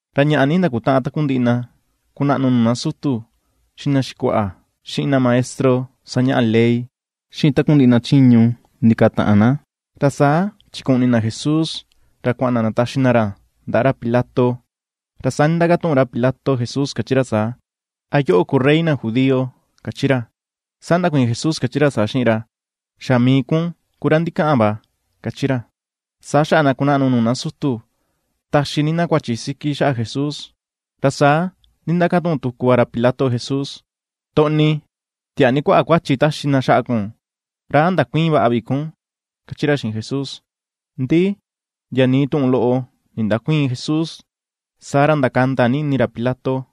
Ra ñaꞌa ni ndakutaꞌan takundiꞌi na kunaꞌnu nuu na sutu, xiꞌin na xikuaꞌa, xiꞌin na maestro sañaꞌa ley, xiꞌin takundiꞌi na chiñu ndikataꞌan na. Ra saa chikuꞌni na Jesús ra kuaꞌan na ndataxi na ra ndaꞌa ra Pilato. Ra saa ndindakatuꞌun ra Pilato Jesús kachi ra saa: ―¿A yoꞌo ku rey na judío? ―kachi ra. Saa ndakuiin Jesús kachi ra saa xiꞌin ra: ―Xa mii kun ku ra ndikaꞌan va ―kachi ra. Saa xaꞌa na kunaꞌnu nuu na sutu taxi ni na kuachi siki xaꞌa Jesús. Ra saa ndindakatuꞌun tuku va ra Pilato Jesús: ―Toꞌni, tiaa ni kuaꞌa kuachi taxi na xaꞌa kun. ¿Ra a ndakuïin vaꞌa vi kun ―kachi ra xiꞌin Jesús. Ndi ndia nii tuꞌun loꞌo ndindäkuiin Jesús, saa ra ndakanda ni ini ra Pilato.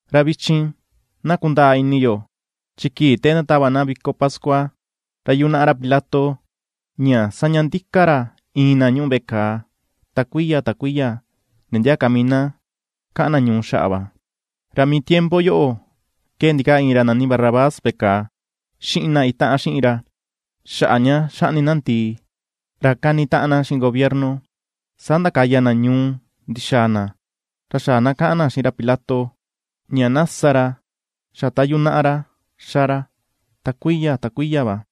Ra vichin na kundaa ini yo, chi kii te ndatava na viko pascua, ra yunaꞌa ra Pilato ña saña ndika ra iin na ñuꞌu veꞌe kàà, ta kuiya ta kuiya, ndia ndia ka mii na kaꞌan na ñuu xaꞌa va. Ra mii tiempo yoꞌo ke ndikaa iin ra nani Barrabás veꞌe kàà, xiꞌin na itaꞌan xiꞌin ra, xaꞌa ña xaꞌni na ndìì, ra kani taꞌan na xiꞌin gobierno. Saa ndakaya na ñuu ndi̱xa̱a̱ na, ra xaꞌa na kaꞌan na xiꞌin ra Pilato ña na sa ra xa ta yunaꞌa ra xa ra, ta kuiya ta kuiya va.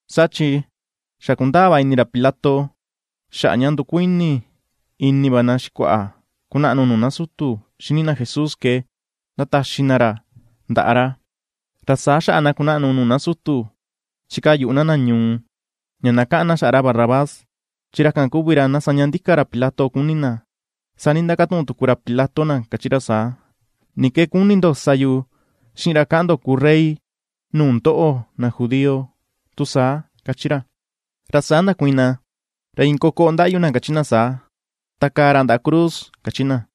Saa chi xa kundaa va ini ra Pilato xaꞌa ña ndukuini ini va na xikuaꞌa ku naꞌnu nuu na sutu xini na Jesús ke ndataxi na ra ndaꞌa ra. Ra saa xaꞌa na kunaꞌnu nuu na sutu chikaa yuꞌu na na ñuu, ña na kaꞌan na xaꞌa ra Barrabás, chi ra kan kuvi ra na saña ndika ra Pilato kuni̱ na. Saa ndindakatuꞌun tuku ra Pilato na kachi ra saa: ―¿Ni ke kuni ndo sa yu xiꞌin ra kaꞌan ndo kuu Rey nuu ndoꞌo na judío, tu saa? ―kachi ra. Ra saa ndakuiin na, ra iin kokoꞌo ndaꞌyu na kachi na saa: ―¡Takaa ra ndaꞌa cruz! ―kachi na.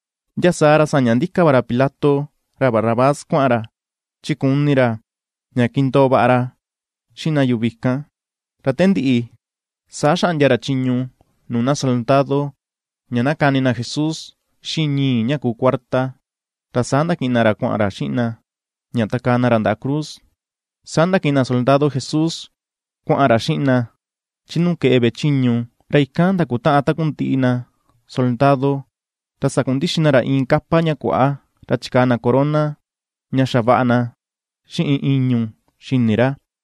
Ndia saa ra saña ndika va ra Pilato ra Barrabás kuaꞌan ra, chi kuni ra ña kindoo vaꞌa ra xiꞌin na yuvi kan. Ra te ndiꞌi, saa xaꞌndia ra chiñu nuu na soldado ña na kani na Jesús xiꞌin ñii̱ ña ku cuarta, ra saa ndakiꞌin na ra kuaꞌan ra xiꞌin na ña takaa na ra ndaꞌa cruz. Saa ndakiꞌin na soldado Jesús kuaꞌan ra xiꞌin na chi nuu keꞌe veꞌe chiñu, ra ikan ndakutaꞌan takundiꞌi na soldado. Ra sandakundixi na ra iin capa ña kuaꞌa, ra chikaa na corona ña xavaꞌa na xiꞌin ìñu̱ xi̱ni̱ ra.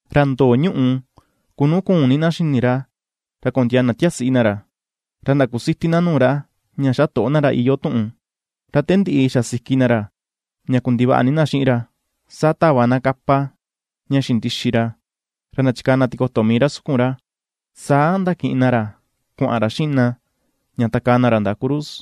Ra ndo̱o̱ ñuꞌu ku nu kuun ni na xi̱ni̱ ra, ra kondiaa na tiasiꞌi na ra, ra ndakusiti na nuu ra, ña xatoꞌo na ra, iyoo tuꞌun. Ra te ndiꞌi xasiki na ra, ña kundivaꞌa ni na xiꞌin ra. Saa tava na capa ña xindixi ra, ra ndachikaa na tikoto mii ra sukun ra, saa ndakiꞌin na ra kuaꞌan ra xiꞌin na ña takaa na ra ndaꞌa cruz.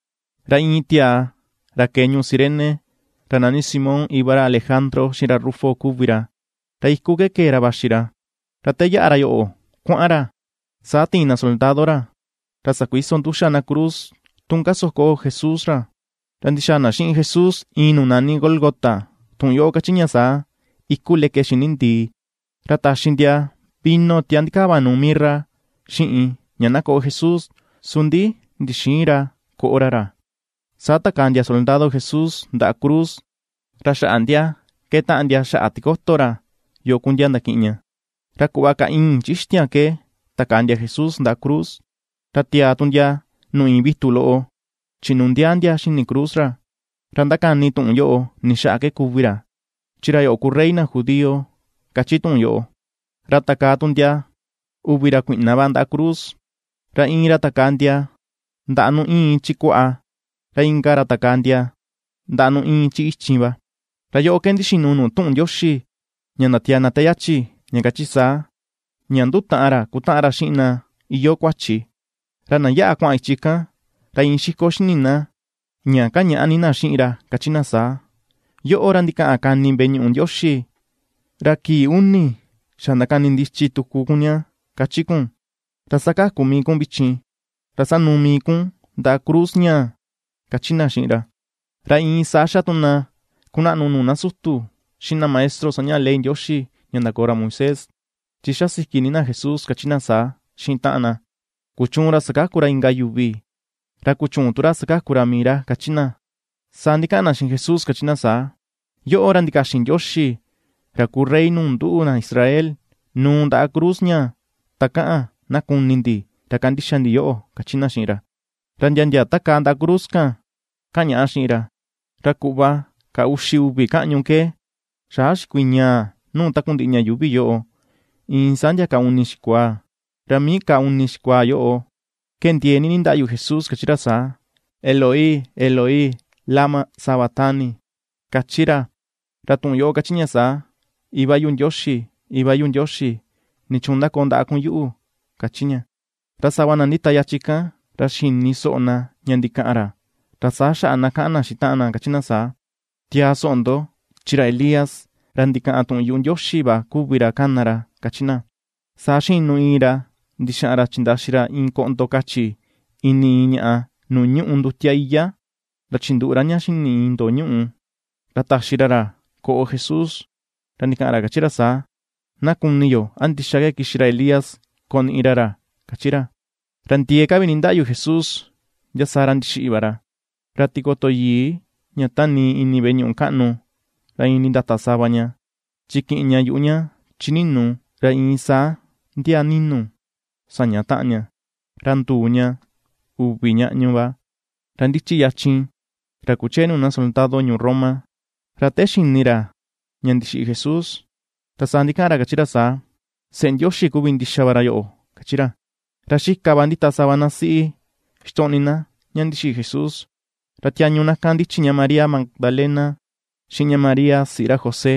Ra iin tiaa ra ke̱e ñuu Cirene, ra nani Simón, iva ra Alejandro xiꞌin ra Rufo kuvi ra, ra iku ke kee ra vaxi ra, ra te yaꞌa ra yoꞌo kuaꞌan ra, saa tiin na soldado ra ra sakuiso nduxa na cruz tun kasoko Jesús ra. Ra ndi̱xa̱a̱ na xiꞌin Jesús iin nuu nani Gólgota, tuꞌun yoꞌo kachi ña saa: “Iku leke xi̱ni̱ ndìì”. Ra taxi ndia vino tia ndikava nuu mirra xiꞌin, ña na koꞌo Jesús; su ndi ndixïin ra koꞌo ra ra. Saa takaa ndia soldado Jesús ndaꞌa cruz, ra xaꞌa ndia ke̱ꞌetaꞌan ndia xaꞌa tikoto ra, yo ku ndia ndakiꞌin ña. Ra kuꞌva ka ìi̱n chi ixtiaan ke takaa ndia Jesús ndaꞌa cruz. Ra tiaa tu ndia nuu iin vitu loꞌo chinundiaa ndia xini cruz ra, ra ndakani tuꞌun yoꞌo ni xaꞌa ke kuvi ra: chi “Ra yoꞌo ku Rey na judío” kachi tuꞌun yoꞌo. Ra takaa tu ndia uvi ra kuiꞌna va ndaꞌa cruz, ra iin ra takaa ndia ndaꞌa nu iin chi kuaꞌa, ra inka ra takaa ndia ndaꞌa nu iin chi ichin va. Ra yoꞌo ke ndixinu nuu tuꞌun Ndioxi ña ndatiaa na te yachi, ña kachi saa: ña “Ndutaꞌan ra kutaꞌan ra xiꞌin na iyoo kuachi”. Ra na yaꞌa kuaꞌan ichi kan, ra iin xiko xi̱ni̱ na ña kañaꞌa ni na xiꞌin ra, kachi na saa: ―¡Yoꞌo ra ndikaꞌan kani veꞌe ñuꞌu Ndioxi, ra kii uni xa ndakanindichi tuku kun ña, kachi kun, ra sakaku mii kun vichin, ra sanùù mii kun ndaꞌa cruz ñaa, ―kachi na xiꞌin ra. Ra iin saa xa tu na kunaꞌnu nuu na sutu, xiꞌin na maestro sañaꞌa ley Ndioxi ña ndakoo ra Moisés, chi xasiki ni na Jesús kachi na saa xiꞌin taꞌan na: ―Kuchuun ra sakaku ra inka yuvi, ra kuchüun tu ra sakaku ra mii ra ―kachi na. Saa ndikaꞌan na xiꞌin Jesús kachi na saa: ―Yoꞌo ra ndikaxin Ndioxi ra ku Rey nuu nduꞌu, na Israel; nuu ndaꞌa cruz ñaa takaꞌan na kuni ndi ra kandixa ndi yoꞌo, ―kachi na xiꞌin ra. Ra ndia ndia takaa ndaꞌa cruz kan, kañaꞌa xiꞌin ra. Ra kuꞌva ka uxi uvi kaꞌñu ke, xaꞌa xikuiñaa nuu takundiꞌi ña yuuvi yoꞌo, iin saa ndia ka uni xikuaa, Ra mii ka uni xikuaa yoꞌo ke ndiee ni ndindaꞌyu Jesús kachi ra saa: ―Eloi, Eloi, ¿lama sabactani? ―kachi ra. Ra tuꞌun yoꞌo kachi ña saa: Iva yu Ndioxi, Iva yu Ndioxi, ¿nichuun ndakoo ndaꞌa kun yuꞌu? kachi ña. Ra sava na ndita yachin kan, ra xini soꞌo na ña ndikaꞌan ra, ra saa xaꞌa na kaꞌan na xiꞌin taꞌan na kachi na saa: ―Tiaa soꞌo ndo chi ra Elías, ra ndikaꞌan tuꞌun yuꞌu Ndioxi va kuvi ra kana ra ―kachi na. Saa xinu iin ra ndixaꞌan ra chindaxi ra iin koꞌndo kachi ini iin ñaꞌa nuu ñuꞌu ndutia iyá, ra chinduꞌu ra ña xi̱ni̱ iin tu ndo̱o̱ ñuꞌu, ra taxi ra ra na koꞌo Jesús, ra ndikaꞌan ra kachi ra saa: ―Na kuni yo a ndixa ke kixi ra Elías koniꞌi ra ra ―kachi ra. Ra ndiee ka vi ndindaꞌyu Jesús, ndia saa ra ndixiꞌi va ra. Ra tikoto yii ña tanii ini veꞌe ñuꞌu kaꞌnu ra iin nindata sava ña, chi kiꞌin ña yuꞌu ña chini̱nù ra iin saa ndia ni̱nu̱ saña taꞌan ña, ra nduu ña uvi ñaꞌñu va. Ra ndichi yachin, ra kuchee nuu na soldado ñuu Roma, ra te xini ra ña ndixiꞌi Jesús, ra saa ndikaꞌan ra, kachi ra saa: ―Seꞌe Ndioxi kuvi ndixa va ra yoꞌo ―kachi ra. Ra xika va ndita sava na siꞌi ixtoꞌni na ña ndixiꞌi Jesús, ra tiañu na kan ndichi María Magdalena, xiꞌin ña María siꞌi ra José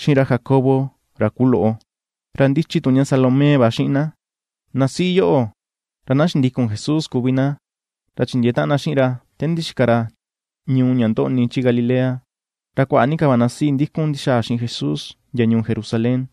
xiꞌin ra Jacobo ra kuloꞌo, ra ndichi tu ña Salomé va xiꞌin na. Na siꞌi yoꞌo ra na xindikun Jesús kuvi na, ra chindiee taꞌan na xiꞌin ra te ndixika ra ñuu ña ndoꞌni chi Galilea, ra kuaꞌa ni ka va na siꞌi ndikun ndi̱xa̱a̱ xiꞌin ra ndia ñuu Jerusalén.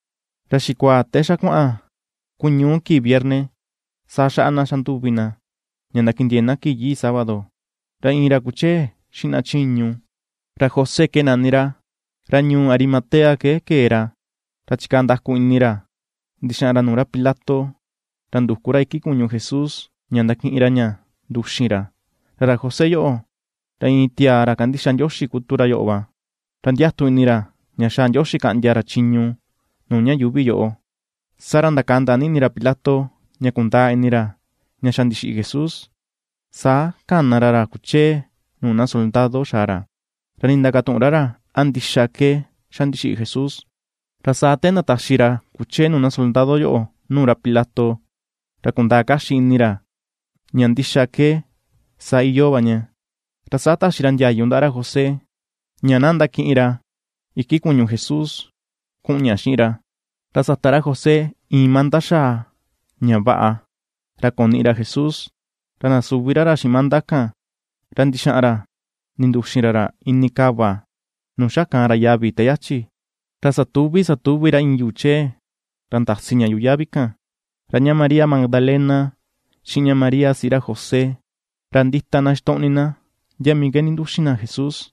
Ra xikuaa te xa kuaꞌan ku ñu̱u kii viernes saa xaꞌa na xanduvi na ña ndakindiee̱ na kii yii sábado. Ra iin ra kuchee xiꞌin na chiñu, ra José ke nani ra, ra ñuu Arimatea ke ke̱e ra, ra chikaa nda̱ku̱ ini ra ndi̱xaꞌan ra nuu ra Pilato, ra nduku ra iki kuñu Jesús ña ndakiꞌin ra ña nduxin ra. Ra ra José yoꞌo ra iin tiaa ra kandixa Ndioxi ku tu ra yoꞌo va, ra ndiatu ini ra ña xaa Ndioxi kaꞌndia ra chiñu nuu ña yuuvi yoꞌo. Saa ra ndakanda ni ini ra Pilato ña kundaa ini ra ña xa ndixiꞌi Jesús. Saa kana ra ra kuchee nuu na soldado xaa ra, ra ndindakatuꞌun ra ra a ndixa ke xa ndixiꞌi Jesús. Ra saa te ndataxi ra kuchee nuu na soldado yoꞌo nuu ra Pilato, ra kundaa kaxi ini ra ña ndixa ke saa iyoo va ña, ra saa taxi ra ndiayu ndaꞌa ra José ña na ndakiꞌin ra iki kuñu Jesús kuꞌun ña xiꞌin ra. Ra sata ra José iin manda xaa, ña vaꞌa, ra koniꞌi ra Jesús ra ndasuvi ra ra xiꞌin manda kan, ra ndixaꞌan ra ndinduxin ra ra ini kava nuu xa kaan ra yavi te yachi, ra satuvi̱ satuvi̱ ra iin yuu chee ra ndasi ña yuꞌu yavi kan. Ra ña María Magdalena xiꞌin ña María siꞌi ra José, ra ndita na ixtoꞌni na ndia mii ke ndinduxin na Jesús.